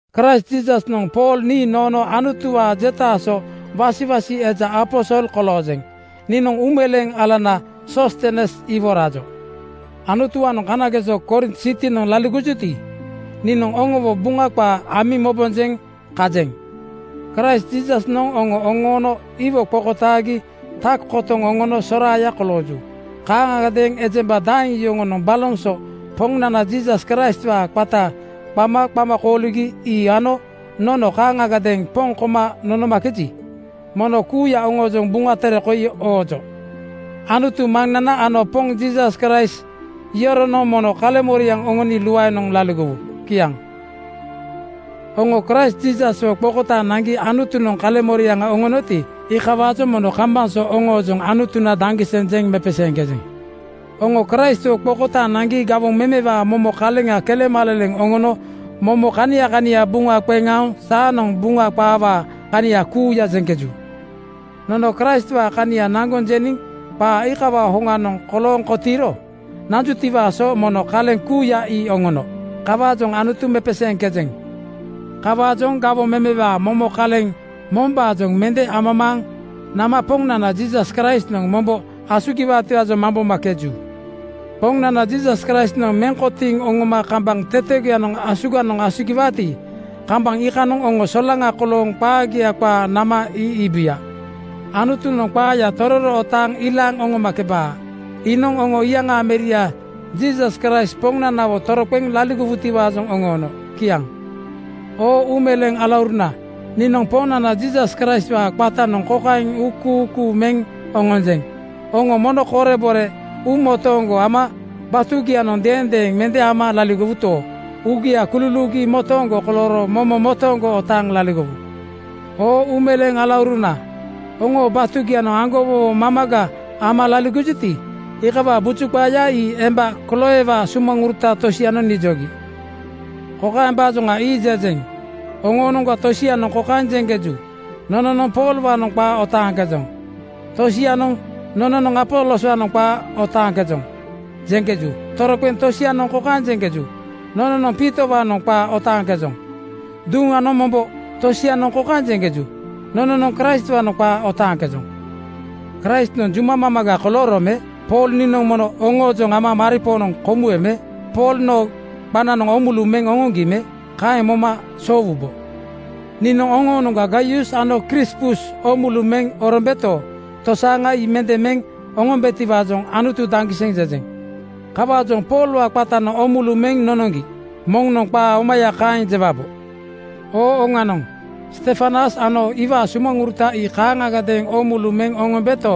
Kraist Jiisasnoŋ Pool nii noono Anutuwaa jetaa so wasiwasi eja aposol koloojeŋ. Niinoŋ uumeleeŋ alana Soostenes iwo rajo. Anutuwaanoŋ kanageso Korint sitinoŋ laligojuti, niinoŋ oŋowo Buŋa qaa amiŋ mobombaajoŋ kajeŋ. Kraist Jiisasnoŋ oŋo oŋoono iwo qokotaagi tak kotoŋ oŋono soraaya kolooju. Kaaŋagadeeŋ ejemba daeŋ yoŋonoŋ baloŋ so Poŋnana Jiisas Kraistwaa qata qama qama kooligi ii ano nono kaaŋgadeeŋ poŋ koma nonomakeji, mono kuuya oŋoojoŋ Buŋa Tere koi oojo. Anutu Maŋnana ano Poŋ Jiisas Kraist yoronoŋ mono kaleŋmoriaŋ oŋoni luaenoŋ laligowu. Kiaŋ. Oŋo Kraist Jiisaswo qokotaaŋ naŋgi Anutunoŋ kaleŋmoriaŋa oŋonoti, iikawaajoŋ mono kambaŋ so oŋoojoŋ Anutuna daŋgiseŋ jeŋ mepeseeŋkejeŋ. Oŋo Kraistwo qokotaaŋ naŋgi gawoŋ memewaa momo kaleŋa kelemaleleŋ oŋono momo kania kania buŋa qeŋ aoŋ saanoŋ Buŋa qaawaa kania kuuya jeŋkeju. Nono Kraistwaa kania naŋgoŋ jeniŋ qaa iikawaa hoŋanoŋ kolooŋ kotiiro nanjutiwaa so momo kaleŋ kuuya ii oŋono. Kawaajoŋ Anutu mepeseeŋkejeŋ. Kawaajoŋ gawoŋ memewaa momo kaleŋ mombaajoŋ mende amamaaŋ nama Poŋnana Jiisas Kraistnoŋ mombo asugiwaatiwaajoŋ mambomakeju. Poŋnana Jiisas Kraistnoŋ meŋ kotiiŋ oŋoma kambaŋ tetegoyanoŋ asuganoŋ asugiwaati, kambaŋ iikanoŋ oŋo solaŋa kolooŋ qaagia qaa nama ii iibuya. Anutunoŋ qaaya tororo otaaŋ ilaaŋ oŋomakebaa. Iinoŋ oŋo iyaŋaa Meria Jiisas Kraist Poŋnanawo toroqeŋ laligowutiwaajoŋ oŋoono. Kiaŋ. Oo uumeleeŋ alauruna, niinoŋ Poŋnana Jiisas Kraistwaa qatanoŋ kokaeŋ uukuukuu meŋ oŋonjeŋ: Oŋo mono korebore uumo-tooŋgo ama batugianoŋ deendeeŋ mende ama laligowuto, uugia kululuugi motooŋgo kolooro momo motooŋgo otaaŋ laligowu. Oo uumeleeŋ alauruna, oŋo batugianoŋ aŋgowowo mamaga ama laligojuti, iikawaa buju qaaya ii emba Kloewaa sumaŋuruta tosianoŋ nijogi. Kokaembaajoŋa ii jejeŋ: Oŋoonoŋga tosianoŋ kokaeŋ jeŋkeju, “Nononoŋ Poolwaanoŋ qaa otaaŋkejoŋ.” Tosianoŋ “Nononoŋ Apoloswaanoŋ qaa otaaŋkejoŋ,” jeŋkeju. Toroqeŋ tosianoŋ kokaeŋ jeŋkeju, “Nononoŋ Piitowaanoŋ qaa otaaŋkejoŋ.” Duŋanoŋ mombo tosianoŋ kokaeŋ jeŋkeju, “Nononoŋ Kraistwaanoŋ qaa otaaŋkejoŋ.” Kraistnoŋ juma mamaga kolooro me? Pool niinoŋ mono oŋoojoŋ ama maripoonoŋ komuwe me? Pool noo qananoŋ oomulu meŋ oŋoŋgi me? Kaeŋ moma soowubo? Niinoŋ oŋoonoŋga Gaius ano Krispus oomulu meŋ orombeto, tosaaŋa ii mende meŋ oŋombetiwaajoŋ “Anutu daŋgiseŋ!” jejeŋ. Kawaajoŋ “Poolwaa qatanoŋ oomulu meŋ nonoŋgi,” moŋnoŋ qaa omaya kaeŋ jewabo. Oo oŋanoŋ, Stefanas ano iwaa sumaŋuruta ii kaaŋagadeeŋ oomulu meŋ oŋombeto,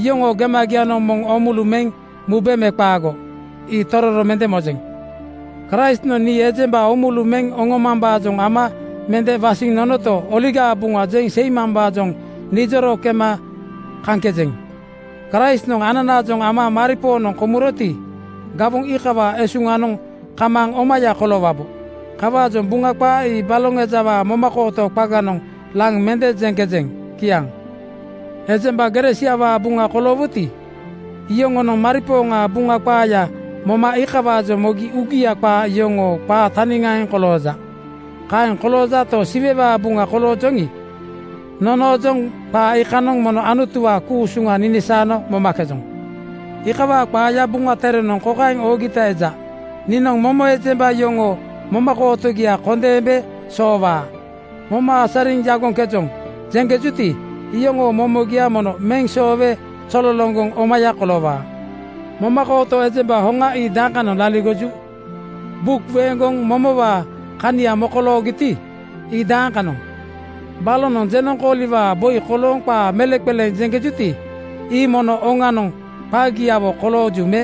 iyoŋoo gemagianoŋ moŋ oomulu meŋ mube me qaago, ii tororo mende mojeŋ. Kraistnoŋ nii ejemba oomulu meŋ oŋomambaajoŋ ama mende wasiŋ nonoto, Oligaa Buŋa jeŋ seimambaajoŋ nijoro kema kaŋkejeŋ. Kraistnoŋ ananaajoŋ ama maripoonoŋ komuroti, gawoŋ iikawaa esuŋanoŋ kamaaŋ omaya koloowabo. Kawaajoŋ Buŋa qaa ii baloŋ ejawaa momakooto qaganoŋ laŋ mende jeŋkejeŋ. Kiaŋ. Ejemba gere siawaa buŋa koloowuti, iyoŋonoŋ maripooŋaa Buŋa qaaya moma iikawaajoŋ mogi uugia qaa yoŋoo qaa taniŋaaŋ kolooja. Kaeŋ koloojato, Siwewaa buŋa koloojoŋi, nonoojoŋ qaa iikanoŋ mono Anutuwaa ku-usuŋa ninisaano momakejoŋ. Iikawaa qaaya Buŋa Terenoŋ kokaeŋ oogita eja, “Niinoŋ momo ejemba yoŋoo momakootogia kondeembe soowaa. ‘Moma asariŋ yagoŋkejoŋ,’ jeŋkejuti, iyoŋoo momogia mono meŋ soowe zololoŋgoŋ omaya koloowaa.” Momakooto ejemba hoŋa ii dakanoŋ laligoju? Buk weeŋgoŋ momowaa kania mokoloogiti, ii dakanoŋ? Balonoŋ jenoŋkooliwaa boi kolooŋ qaa meleŋqeleema jeŋkejuti, ii mono oŋanoŋ qagiawo kolooju me?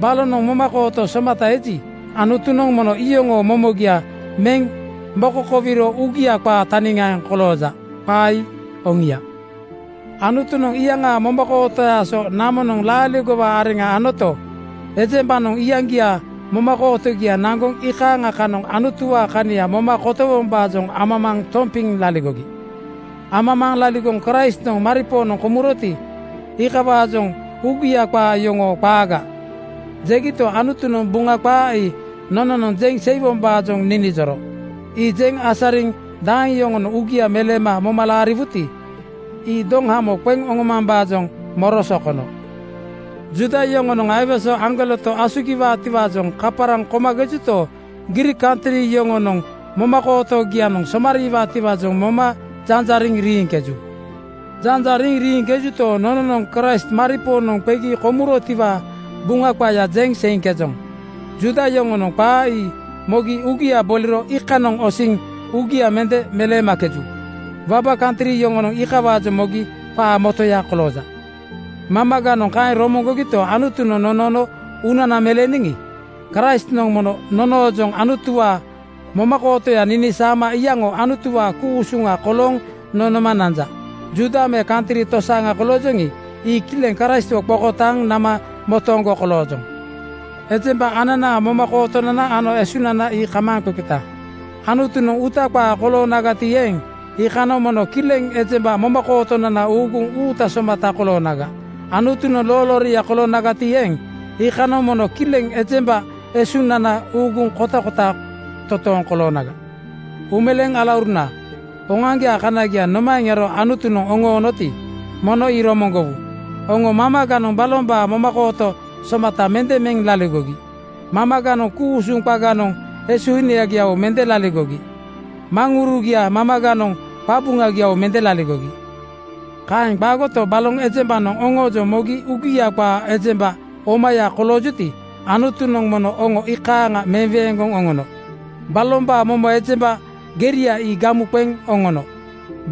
Balonoŋ momakooto somata eji, Anutunoŋ mono iyoŋoo momogia meŋ mokokowiro uugia qaa taniaaŋ kolooja. Qaa ii oŋia. Anutunoŋ iyaŋaa momakootoyaa so namonoŋ laaligowaa areŋa anoto, ejembanoŋ iyaŋgiaa momakootogia naŋgoŋ iikaaŋa kanoŋ Anutuwaa kania moma kotowombaajoŋ amamaaŋ tompiŋ laligogi. Amamaaŋ laligoŋ Kraistnoŋ maripoonoŋ komuroti, iikawaajoŋ “Uugia qaa yoŋoo qaaga!” jegito, Anutunoŋ Buŋa qaa ii nononoŋ jeŋ seiwoŋiwaajoŋ ninijoro. Ii jeŋ asariniŋ daeŋ yoŋonoŋ uugia meleema moma laariwuti, ii doŋhamo qeŋ oŋomambaajoŋ moro sokono. Juuda yoŋonoŋ aiwese aŋgoleto asugiwutiwaajoŋ kaparaŋ komakejuto, Griik kantri yoŋonoŋ momakootogianoŋ somariwaatiwaajoŋ moma janjariŋ riiŋkeju. Ii janjariŋ riiŋkejuto, nononoŋ Kraist maripoonoŋ qegi komurotiwaa Buŋa qaaya jeŋ seiŋkejoŋ. Juuda yoŋonoŋ qaa ii mogi uugia boliro iikanoŋ osiŋ uugia mende meleemakeju. Waba kantri yoŋonoŋ iikawaajoŋ mogi qaa motoya kolooja. Mamaganoŋ kaeŋ romoŋgojuto, Anutunoŋ nonoono uunana meleeniŋi, Kraistnoŋ mono nonoojoŋ Anutuwaa momakootoya ninisaama iyaŋo Anutuwaa ku-usuŋa kolooŋ nonoma nanja. Juuda me kantri tosaaŋa koloojoŋi, ii kileŋ Kraistwo qokotaaŋ nama motooŋgo koloojoŋ. Ejemba ananaa momakootonana ano esunana ii kamaaŋqeqeta. Anutunoŋ uuta qaa koloonagati eeŋ, iikanoŋ mono kileŋ ejemba momakootonana uuguŋ uuta somata koloonaga. Anutunoŋ loolooria koloonagati eeŋ, iikanoŋ mono kileŋ ejemba esunana uuguŋ kotakota totooŋ koloonaga. Uumeleeŋ alauruna, oŋoaŋgiaa kanagia nomaeŋ ero Anutunoŋ oŋoonoti, mono ii romoŋgowu? Oŋo mamaganoŋ balombaa momakooto somata mende meŋ laligogi. Mamaganoŋ ku-usuŋ qaganoŋ esuhinagiawo mende laligogi. Maŋurugia mamaganoŋ qabuŋagiawo mende laligogi. Kaeŋ qaagoto, baloŋ ejembanoŋ oŋoojoŋ mogi uugia qaa ejemba omaya koloojuti, Anutunoŋ mono oŋo iikaaŋia meweeŋgoŋ oŋono. Balombaa momo ejemba geria ii gamu qeŋ oŋono.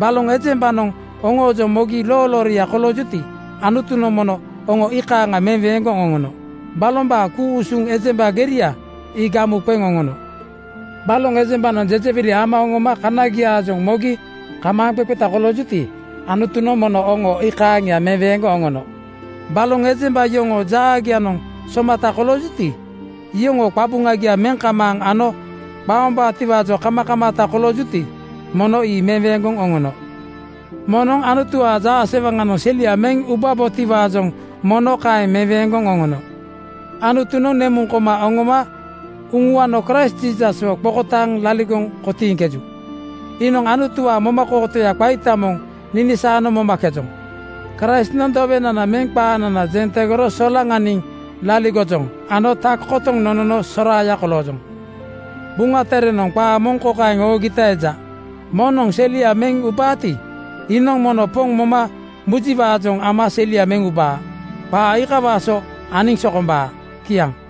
Baloŋ ejembanoŋ oŋoojoŋ mogi loolooria koloojuti, Anutunoŋ mono oŋo iikaaŋa meweeŋgoŋ oŋono. Balombaa ku-usuŋ ejemba geria ii gamu qeŋ oŋono. Baloŋ ejembanoŋ jejewili ama oŋoma kanagiaajoŋ mogi kamaaŋqeqeta koloojuti, Anutunoŋ mono oŋo iikaaŋia meweeŋgoŋ oŋono. Baloŋ ejemba yoŋoo jaagianoŋ somata koloojuti, iyoŋoo qabuŋagia meŋ kamaaŋ ano qaombaatiwaajoŋ kamakamaata koloojuti, mono ii meweeŋgoŋ oŋono. Moŋnoŋ Anutuwaa jaasewaŋanoŋ selia meŋ ubabotiwaajoŋ mono kaeŋ meweeŋgoŋ oŋono. Anutunoŋ nemuŋ koma oŋoma uŋuano Kraist Jiisaswo qokotaaŋ laligoŋ kotiiŋkeju. Iinoŋ Anutuwaa momakootoya qaita moŋ ninisaano momakejoŋ. Kraistnoŋ dowenana meŋ qaanana jeŋ tegoro solaŋaniŋ laligojoŋ ano tak kotoŋ nonono soraaya koloojoŋ. Buŋa Terenoŋ qaa moŋ kokaeŋ oogita eja, “Moŋnoŋ selia meŋ ubaati, iinoŋ mono Poŋ moma mujiwaajoŋ ama selia meŋ uba.” Qaa iikawaa so aniŋ sokombaa. Kiaŋ.